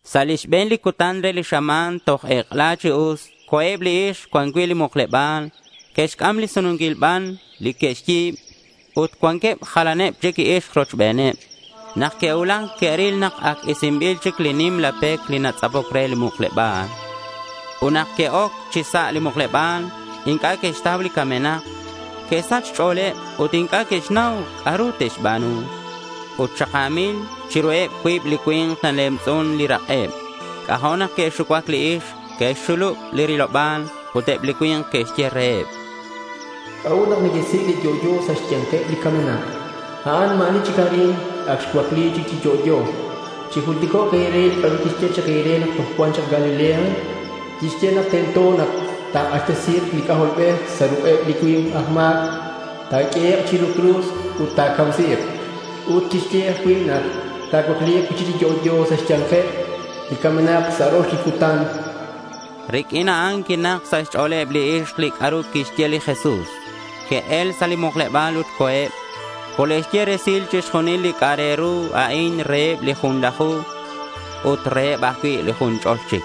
Sa' li xbe̱n li cutan re li xama̱n, toj ek'ela chi us, co̱eb li ixk cuan cui' li mukleba̱l. Que'xc'am li sununquil ban li que'xyi̱b. Ut cuanqueb jalaneb chic ixk rochbeneb. Nak que'cuulac, que'ril nak ac isinbil chic li nimla pec li natz'apoc re li mukleba̱l. Ut nak que'oc chi sa' li mukleba̱l, inc'a' que'xtau li camenak. Que'sach xch'o̱leb ut inc'a' que'xnau c'a'ru te'xba̱nu. Ut xaka̱mil chiruheb cuib li cui̱nk. Nalemtz'un li rak'eb. C'ajo' nak que'xucuac li ixk. Que'xxulub li riloba̱l. Ut eb li cui̱nk que'xye reheb: —¿C'a'ut nak nequesic' li yo'yo sa' xya̱nkeb li camenak? A'an ma̱ ani chic arin. Ac xcuacli cui'chic chi yo'yo. Chijulticok' e̱re li c'a'ru quixye chak nak toj cua̱nk chak Galilea. Quixye nak tento ta̱k'axtesi̱k li C'ajolbej sa' ruk'eb li cui̱nk aj ma̱c. Ta̱q'uehek' chiru cruz ut ta̱camsi̱k. Ut quixye ajcui' nak ta̱cuacli̱k cui'chic chi yo'yo sa' xya̱nkeb li camenak sa' rox li cutan, chanqueb. Riq'uin a'an quinak sa' xch'o̱leb li ixk li c'a'ru quixye li Jesús. Que'el sa' li mukleba̱l ut co̱eb. Cole'xye resil chixjunil li c'a'ak re ru a'in reheb li junlaju ut reheb ajcui' li jun ch'ol chic.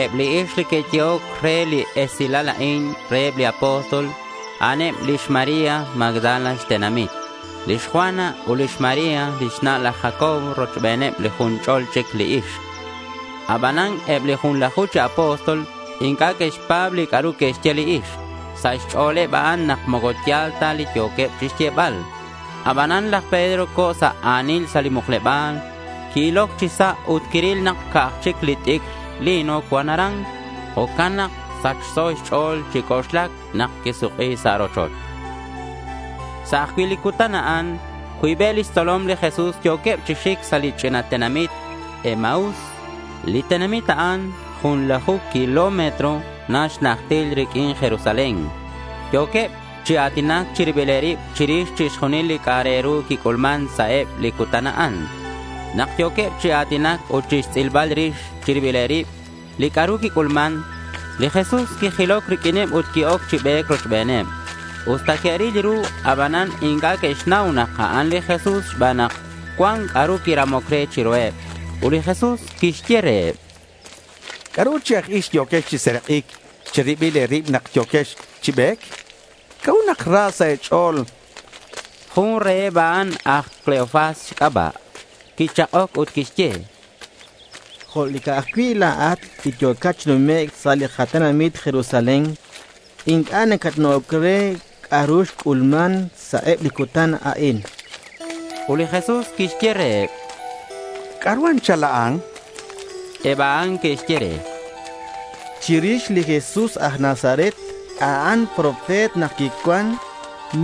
Eb li ixk li que'yehoc re li esilal a'in reheb li apóstol, a'an eb lix María Magdala xtenamit, lix Juana ut lix María lix na' laj Jacobo rochbeneb li jun ch'ol chic li ixk. Abanan eb li junlaju chi apóstol inc'a' que'xpa̱b li c'a'ru que'xye li ixk. Sa' xch'o̱leb a'an nak moco ya̱l ta li yo̱queb chixyebal. Abanan laj Pedro co̱ sa' a̱nil sa' li mukleba̱l. Qui-iloc chi sa' ut quiril nak ca'aj chic li t'icr lino cuan aran. Jo'can nak sachso xch'o̱l chi c'oxlac nak quisuk'i sa' rochoch. Sa' ajcui' li cutan a'an, cuibeb lix tzolom li Jesús yo̱queb chi xic sa' li ch'ina tenamit Emaús. Li tenamit a'an junlaju kilómetro na xnajtil riq'uin Jerusalén. Yo̱queb chi a̱tinac chi rilbileb rib chirix chixjunil li c'a'ak re ru quic'ulman sa' eb li cutan a'an. Nak yo̱queb chi a̱tinac ut chixtz'ilbal rix chi ribileb rib li c'a'ru quic'ulman, li Jesús quijiloc riq'uineb ut qui-oc chi be̱c rochbeneb. Usta que'ril ru, abanan inc'a' que'xnau nak a'an li Jesús xban nak cuan c'a'ru quiramoc re chiruheb. Ut li Jesús quixye reheb: —¿C'a'ru chi aj ix yo̱quex chi serak'ic chi ribil e̱rib nak yo̱quex chi be̱c? ¿C'a'ut nak ra sa' e̱ch'o̱l? chan reheb. Jun reheb a'an, aj Cleofas xc'aba', quichak'oc ut quixye: —Jo' li ca'aj cui' la̱at li yo̱cat chi numec' sa' li tenamit Jerusalén li inc'a' nacatna'oc re li c'a'ru xc'ulman sa' eb li cutan a'in, chan. Ut li Jesús quixye reheb: —¿C'a'ru anchal a'an? chan. Eb a'an que'xye re: —Chirix li Jesús aj Nazaret. A'an profeta nak quicuan.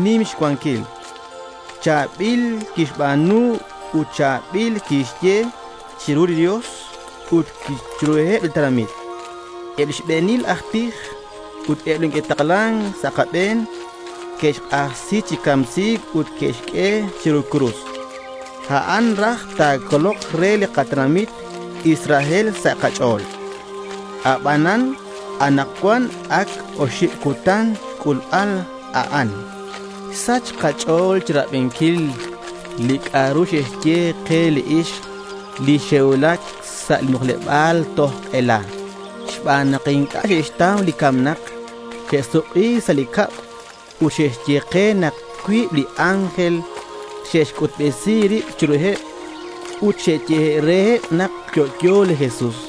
Nim xcuanquil. Cha̱bil quixba̱nu ut cha̱bil quixye chiru li Dios ut chiruheb li tenamit. Eb li xbe̱nil aj tij ut eb li neque'taklan sa' kabe̱n que'xk'axtesi chi camsi̱c ut que'xq'ue chiru cruz. A'an raj li ta̱colok re li katenamit Israel sa' kach'o̱l. Abanan anakcuan ac oxib cutan xc'ulbal a'an. Xsach kach'o̱l chirabinquil li c'a'ru xe'xye ke li ixk li xe'cuulac sa' li mukleba̱l toj ek'ela. Xban nak inc'a' xe'xtau li camenak, xe'suk'i sa' cab ut xe'xye ke nak cuib li ángel xe'xc'utbesi rib chiruheb ut xe'xye reheb nak yo'yo li Jesús.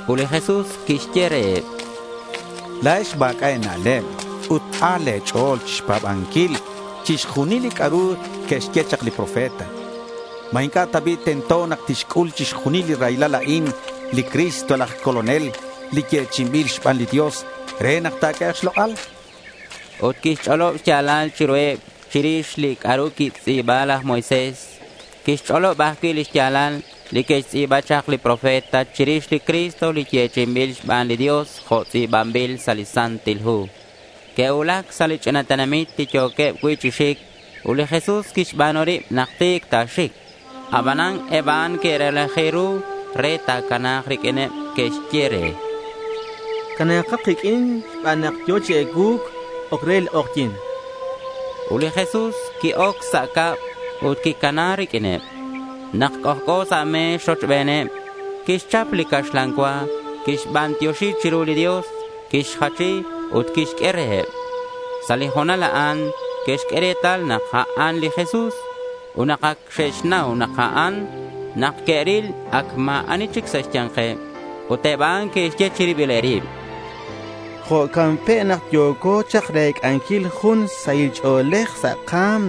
Ut li Jesús quixye reheb: —¡La̱ex ma̱c'a' e̱na'leb ut a̱l le̱ ch'o̱l chixpa̱banquil chixjunil li c'a'ru que'xye chak li profeta! ¿Ma inc'a' ta bi' tento nak tixc'ul chixjunil li raylal a'in li Cristo laj Colonel li yechi'inbil xban li Dios re nak ta̱q'uehek' xlok'al? chan reheb. Ut quixch'olob xya̱lal chiruheb chirix li c'a'ru quixtz'i̱ba laj Moisés. Quixch'olob ajcui' li xya̱lal li que'xtz'i̱ba chak li profeta chirix li Cristo li yechi'inbil xban li Dios jo' tz'i̱banbil sa' li Santil Hu. Que'cuulac sa' li ch'ina tenamit li yo̱queb cui' chi xic. Ut li Jesús quixba̱nu rib nak ti̱c ta̱xic. Abanan eb a'an que'relaji ru re ta̱cana̱k riq'uineb. Que'xye re: —Cana̱kat kiq'uin xban nak yo̱ chi ecuu̱c. Oc re li k'ojyi̱n, chanqueb re. Ut li Jesús qui-oc sa' cab ut quicana riq'uineb. Nak c'ojc'o sa' me̱x rochbeneb, quixchap li caxlan cua, quixbantioxi chiru li Dios, quixjachi ut quixq'ue reheb. Sa' li ho̱nal a'an que'xq'ue retal nak a'an li Jesús. Ut nak ac xe'xnau nak a'an, nak que'ril ac ma̱ ani chic sa' xya̱nkeb. Ut eb a'an que'xye chi ribileb rib: —Jo'can pe' nak yo̱co chak rec'anquil jun sahil ch'o̱lej sa' ka̱m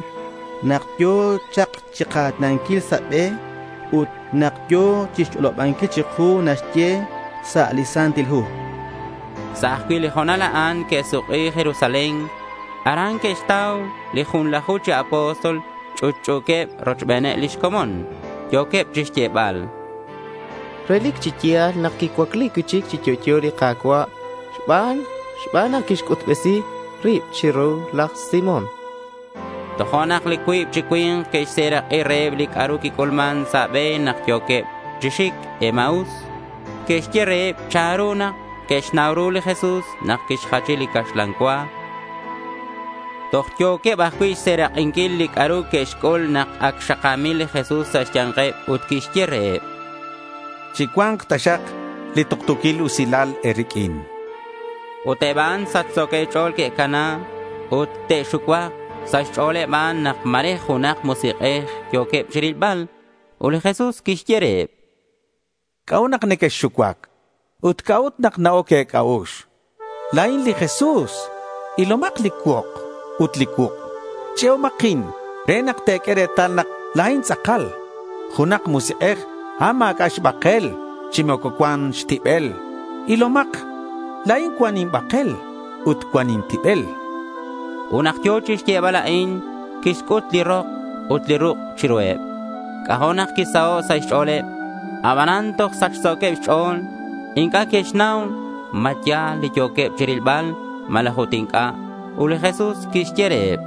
nak yo̱ chak chika̱tinanquil sa' be ut nak yo̱ chixch'olobanquil chiku li naxye sa' li Santil Hu, chanqueb. Sa' ajcui' li ho̱nal a'an que'suk'i Jerusalén. Aran que'xtau li junlaju chi apóstol ch'utch'u̱queb rochbeneb lix comon. Yo̱queb chixyebal: —Relic chi ya̱l nak xcuacli cui'chic chi yo'yo li Ka̱cua' xban nak xc'utbesi rib chiru laj Simón, chanqueb. Tojo'nak li cuib chi cui̱nk que'xserak'i reheb li c'a'ru quic'ulman sa' be nak yo̱queb chi xic Emaús. Que'xye reheb chanru nak que'xnau ru li Jesús nak quixjachi li caxlan cua. Toj yo̱queb ajcui' xserak'inquil li c'a'ru que'xc'ul nak ac xaka̱mil li Jesús sa' xya̱nkeb ut quixye reheb: —¡Chicua̱nk taxak li tuktu̱quil usilal e̱riq'uin! chan reheb. Ut eb a'an sachso̱queb xch'o̱l que'cana ut te'xucuak. Sa' xch'o̱leb a'an nak ma̱re junak musik'ej yo̱queb chirilbal. Ut li Jesús quixye reheb: —¿C'a'ut nak nequexxucuac? Ut, ¿c'a'ut nak na-oc e̱c'a'ux? La̱in li Jesús. Ilomak li cuok ut li cuuk'. Ch'e'omakin re nak te̱q'ue retal nak la̱in tz'akal. Junak musik'ej, a'an ma̱c'a' xbakel, chi moco cuan xtibel. Ilomak. La̱in cuan inbakel ut cuan intibel, chan reheb. Ut nak yo̱ chixyebal a'in, quixc'ut li rok ut li ruk' chiruheb. C'ajo' nak quisaho' sa' xch'o̱leb. Abanan toj sachso̱queb xch'o̱l. Inc'a' que'xnau ma ya̱l li yo̱queb chirilbal malaj ut inc'a'. Ut li Jesús quixye reheb: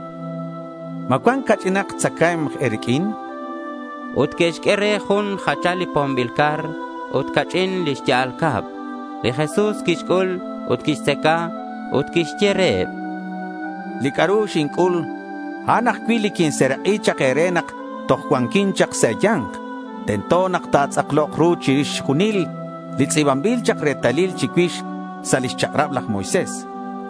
—¿Ma cuan ca'ch'inak tzacae̱mk e̱riq'uin? chan reheb. Ut que'xq'ue re jun jachal li pombil car ut ca'ch'in li xya'al cab. Li Jesús quixc'ul ut quixtzaca. Ut quixye reheb: —Li c'a'ru xinc'ul, a'an ajcui' li quinserak'i chak e̱re nak toj cuanquin chak sa' e̱ya̱nk. Tento nak ta̱tz'aklok ru chixjunil li tz'i̱banbil chak retalil chicuix sa' lix chak'rab laj Moisés,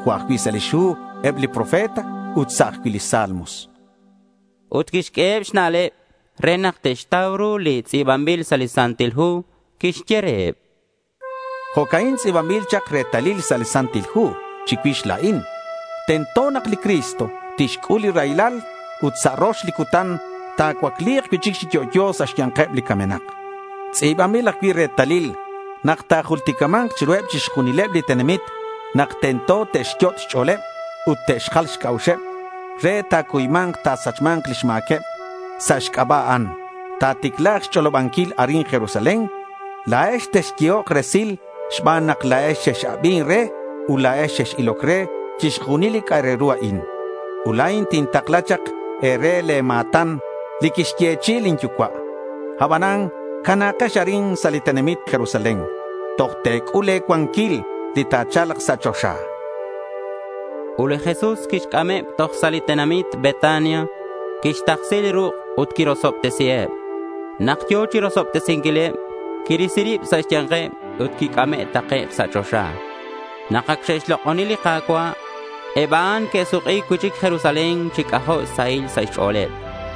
jo' ajcui' sa' lix hu eb li profeta ut sa' ajcui' li Salmos, chan reheb. Ut quixq'ueheb xna'leb re nak te'xtau ru li tz'i̱banbil sa' li Santil Hu. Quixye reheb: —Jo'ca'in tz'i̱banbil chak retalil sa' li Santil Hu chicuix la̱in: tento nak li Cristo tixc'ul li raylal ut sa' rox li cutan ta̱cuacli̱k cui'chic chi yo'yo sa' xya̱nkeb li camenak. Tz'i̱banbil ajcui' retalil nak ta̱julticama̱nk chiruheb chixjunileb li tenamit nak tento te'xyot' xch'o̱leb ut te'xjal xc'a'uxeb re ta̱cuyma̱nk ta̱sachma̱nk lix ma̱queb sa' xc'aba' a'an. Ta̱ticla̱k xch'olobanquil arin Jerusalén. La̱ex texyehok resil xban nak la̱ex xex-abin re ut la̱ex xex-iloc re chixjunil li c'a'ak re ru a'in. Ut la̱in tintakla chak e̱re le̱ ma̱tan li quixyechi'i lin Yucua'. Abanan cana̱kex arin sa' li tenamit Jerusalén toj te̱c'ul le̱ cuanquil li ta̱cha̱lk sa' choxa, chan li Jesús reheb. Ut li Jesús quixc'ameb toj sa' li tenamit Betania. Quixtaksi li ruk' ut quirosobtesiheb. Nak yo̱ chirosobtesinquileb, quirisi rib sa' xya̱nkeb ut quic'ame' takec' sa' choxa. Nak ac xe'xlok'oni li Ka̱cua', eb a'an que'suk'i cui'chic Jerusalén chi c'ajo' xsahil sa' xch'o̱leb.